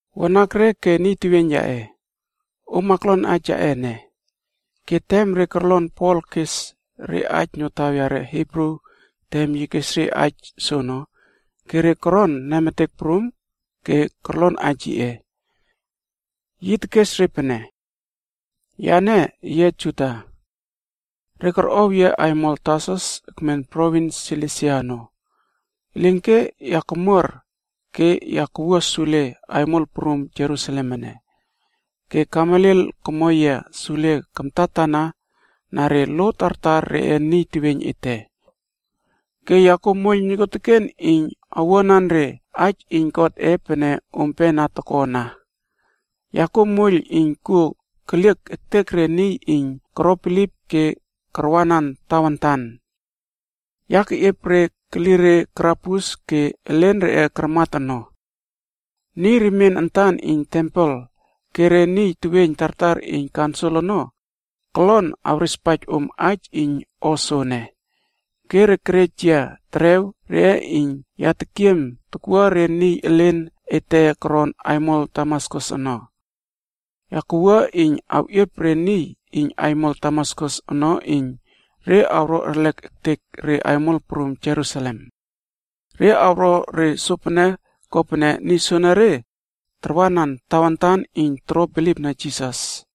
“Wanakre ke niy teweiyn yaꞌe, om aklon aij yaꞌe ene.” Ke tem re korlon Pol kes re aij notaw yare Hibru tem yi kes re aij soono, ke re koron nemetek prum ke korlon aij yiꞌe. Yi tekes re pene, “Yane yia Juda. Re korꞌow yia aimol Tarsus ekmen provins Silisia ono. Elinke ya kamuar ke ya kawua sule aimol prum Jerusalem ene. Ke Gamaliel komo yia sule kamtatana na re lo tartar reꞌe niy teweiyn ete. Ke ya kuow moiyl nokuoteken iyn owuanan re aij iyn Godꞌe pene ompe na toko ana. Ya kuo moiyl iyn kuo keliek ektek re niy iyn koro bilip ke karwanan Tawantan. Ya keꞌiep re keli re karabus ke elen reꞌe karmat ono. Niy remien antan iyn tempel ke re niy teweiyn tartar iyn kaunsil ono kolon awrespaij om aij iyn o soene. Ke re kerej yia terew reꞌe iyn ya tekiem takwua re niy elen ete koron aimol Damaskus ono. Ya kawua iyn awꞌiep re niy iyn aimol Damaskus ono iyn re awro erlek ektek re aimol prum Jerusalem. Re awro re sopene kopene niy soenere tarwanan Tawantan iyn toro bilipna Jisas.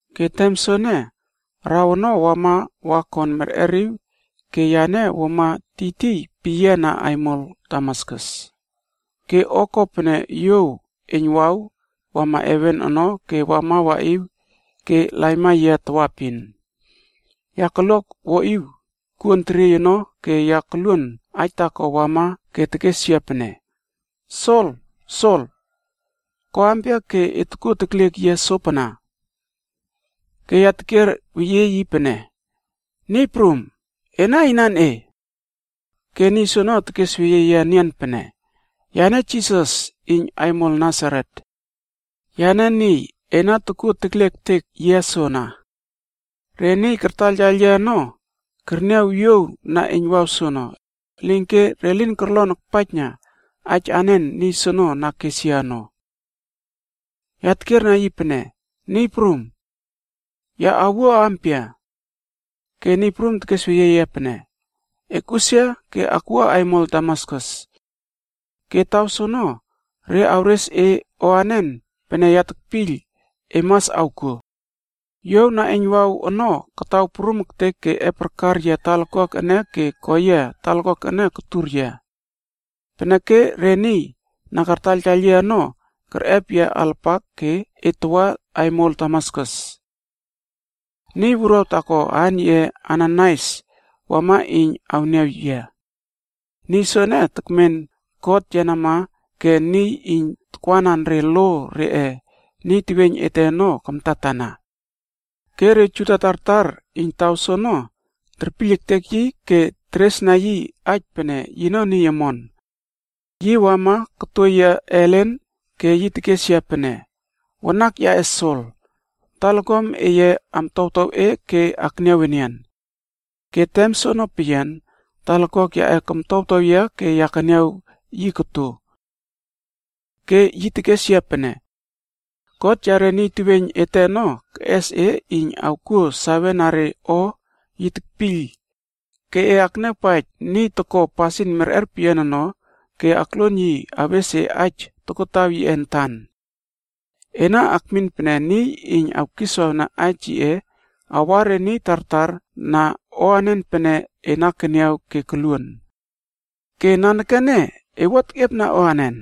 “Ke tem soene, araw ono wama wa kon merꞌeriw ke yane wuama tiytiy peyiana aimol Damaskus. Ke o kopene yuow eiynwaw wama heven ono ke wama waꞌiw ke laima yia tawaepin. Ya kalua wuaꞌiw kuon teriey ono ke ya koluon aij taako wama ke tekes yia pene, ‘Sol! Sol! Ko ampia ke e tokuo tekliek yia sopana?’ “Ke ya tekier weyie yi pene, ‘Niy Prum, ena inan e?’ Ke niy soono tekesweyie yia enian pene, ‘Yane Jisas iyn aimol Nasaret. Yane niy, e na tokuo tekliek ektek yia soana.’ Re niy kartaiyltaiyl yia ono kerniaw yuow na eiynwaw soono, elinke re lin korlon akpaijna aij anen niy soono na kes yia ono. “Ya tekiera yi pene, ‘Niy Prum, ke ya awuo ampia?’ Ke Niy Prum tekesweyie yia pene, ‘E akꞌusia ke akwua aimol Damaskus. Ke taw soono, re awres e o anen pene ya tekpiyl e mas awkuo.’ Yuow na eiynwaw ono kataw prum ektek ke epꞌarkar yia talakuak ene ke ko yia talakuak ene kotur yia. Peneke re niy na kartaiyltaiyl yia ono kerꞌep yia alapak ke et tawa aimol Damaskus. “Niy wuruaw taako aan yiꞌe Ananaias wama iyn awniaw yia. Niy soene, tekmen God yenama ke niy iyn takwanan re lo reꞌe niy teweiyn ete ono kamtatana. Ke re Juda tartar iyn taw soono terpiyl ektek yi ke teresna yi aij pene yino niy omon. Yi wama koto yia ellen ke yi tekes yia pene, ‘Wanak yaꞌe Sol, talakuam eye amtowtow e ke e akniaw enian.’ Ke tem soono peyian, talakuak yaꞌe komtowtow yia ke ya keniaw yi koto. “Ke yi tekes yia pene, ‘God yare niy teweiyn ete ono keꞌes e iyn e awkuo sawena re o yi tekpiyl, ke e akniawpaij Niy Toko Pasin Merꞌer Peyian ono ke akluon yi awes e aij tokotaw yiꞌe antan. Ena akmin pene niy iyn awkiswawna aij yiꞌe awa re niy tartar na o anen pene e na keniaw ke koluon. Ke nanekene e wua tekꞌiepna anen?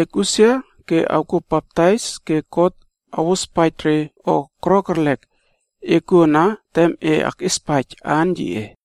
Ekꞌusia ke e awkuo baptais ke God awospaij re o koro kerlek e kuo ana tem e akꞌiespaij aan yiꞌe.’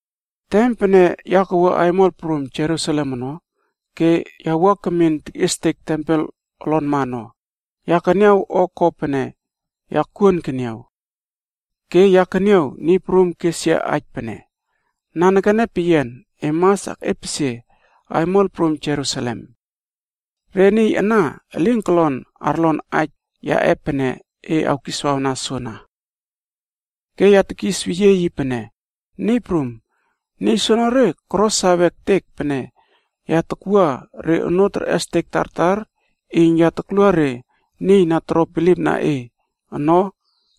“Tem pene ya kawua aimol prum Jerusalem ono ke ya wua kemin tekꞌiestek tempel olonma ono, ya keniaw o ko pene ya kuon keniaw. Ke ya keniaw Niy Prum kes yia aij pene, ‘Nanekene peyian e mas akꞌiepesie aimol prum Jerusalem. Re niy ana elin kolon arlon aij yaꞌe pene e awkiswawna soana.’ “Ke ya tekis weyie yi pene, ‘Niy Prum, niy soenere koro sawe ektek pene ya takwua re onoo terꞌestek tartar iyn ya taklua re niy na toro bilipna e ono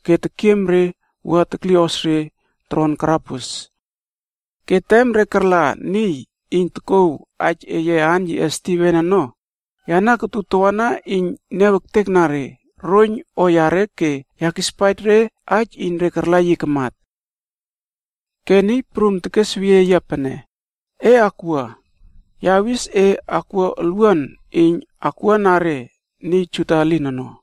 ke tekiem re wua tokuiylꞌos re toron karabus. Ke tem re karla niy iyn tokouw aij eye aan yiꞌe Stiven ono, yane kotu tawana iyn ya niaw ektekna re roiyn o yare ke ya kispaij re aij iyn re karla yi kamat.’ “Ke Niy Prum tekesweyie yia pene, ‘E akwua, ya awis e akwua olwuan iyn akwuana re niy Juda elin ono.’”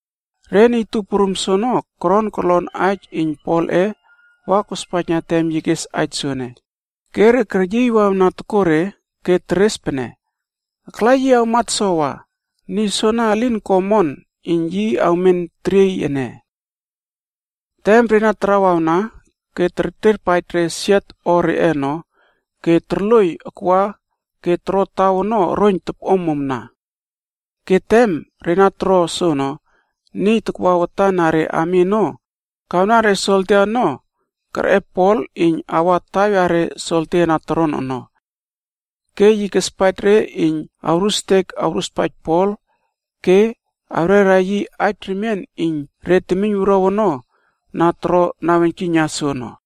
Re niy tup prum soono koron korlon aij iyn Polꞌe wa kospaijna tem yi kes aij soene, ke re keryiy wawna tokore ke teres pene, “Akla yi awmat sowa, niy soana elin ko omon iyn yi awmen teriey ene.” Tem re na tarawawna ke kerterpaij re siot o reꞌe ono ke torloiy akwa ke toro taw ono oroiyn topꞌomomna. Ke tem re na toro soono, niy takwa watan na re ami ono kawna re soldia ono kerꞌep Pol iyn awa taw yare soldia na toron ono. Ke yi kespaij re iyn awrustek awruspaij Pol ke awrera yi aij remien iyn re temiyn wuruaw ono na toro naweiynkiyna soono.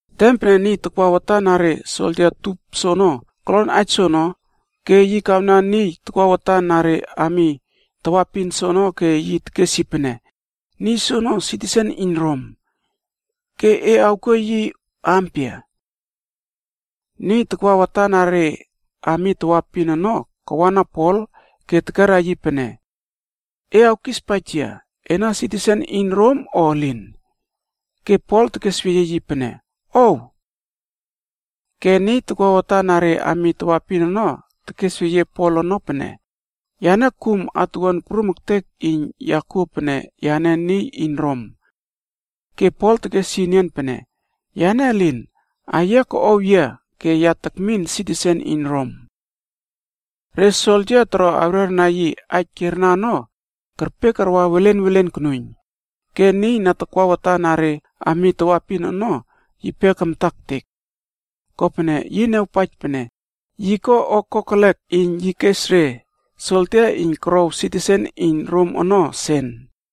Tem pene niy takwa watan na re soldia tup soono kolon aij soono, yi kawana niy takwa watan na re ami tawaepin soono ke yi tekes yi pene, “Niy soono sitisen iyn Rom. Ke e awkuo yi ampia?” Niy takwa watan na re ami tawaepin ono kawana Pol ke tekerna yi pene, “E awkispaij yia, ena sitisen iyn Rom o elin?” Ke Pol tekesweyie yi pene, “Ow!” Ke niy takwa watan na re ami tawaepin ono tekesweyie Pol ono pene, “Yane kum atuwuan prum ektek iyn ya kuo pene yane niy iyn Rom.” Ke Pol tekes yi enian pene, “Yane elin, aiyia koꞌow yia ke ya tekmin sitisen iyn Rom.” Re soldia toro awrerna yi aij kierna ono kerpe karwa welen welen konuiyn. Ke niy na takwa watan na re ami tawaepin ono yipe kamta ektek. Kopene yi niawpaij pene yi ko o kokelek iyn yi kes re soldia iyn korow sitisen iyn Rom ono sen.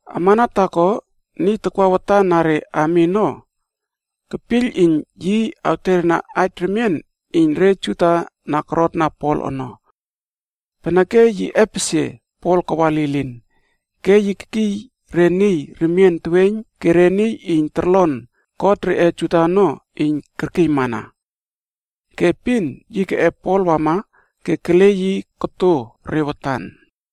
Amana taako, niy takwa watan na re ami ono kepiyl iyn yi awterna aij remien iyn re Juda na korotna Pol ono. Peneke yi epesie Pol kawa lilin, ke yi kekiy re niy remien teweiyn ke re niy iyn torlon kot reꞌe Juda ono iyn arkiymana. Ke epin yi keꞌep Pol wama ke kele yi koto re watan.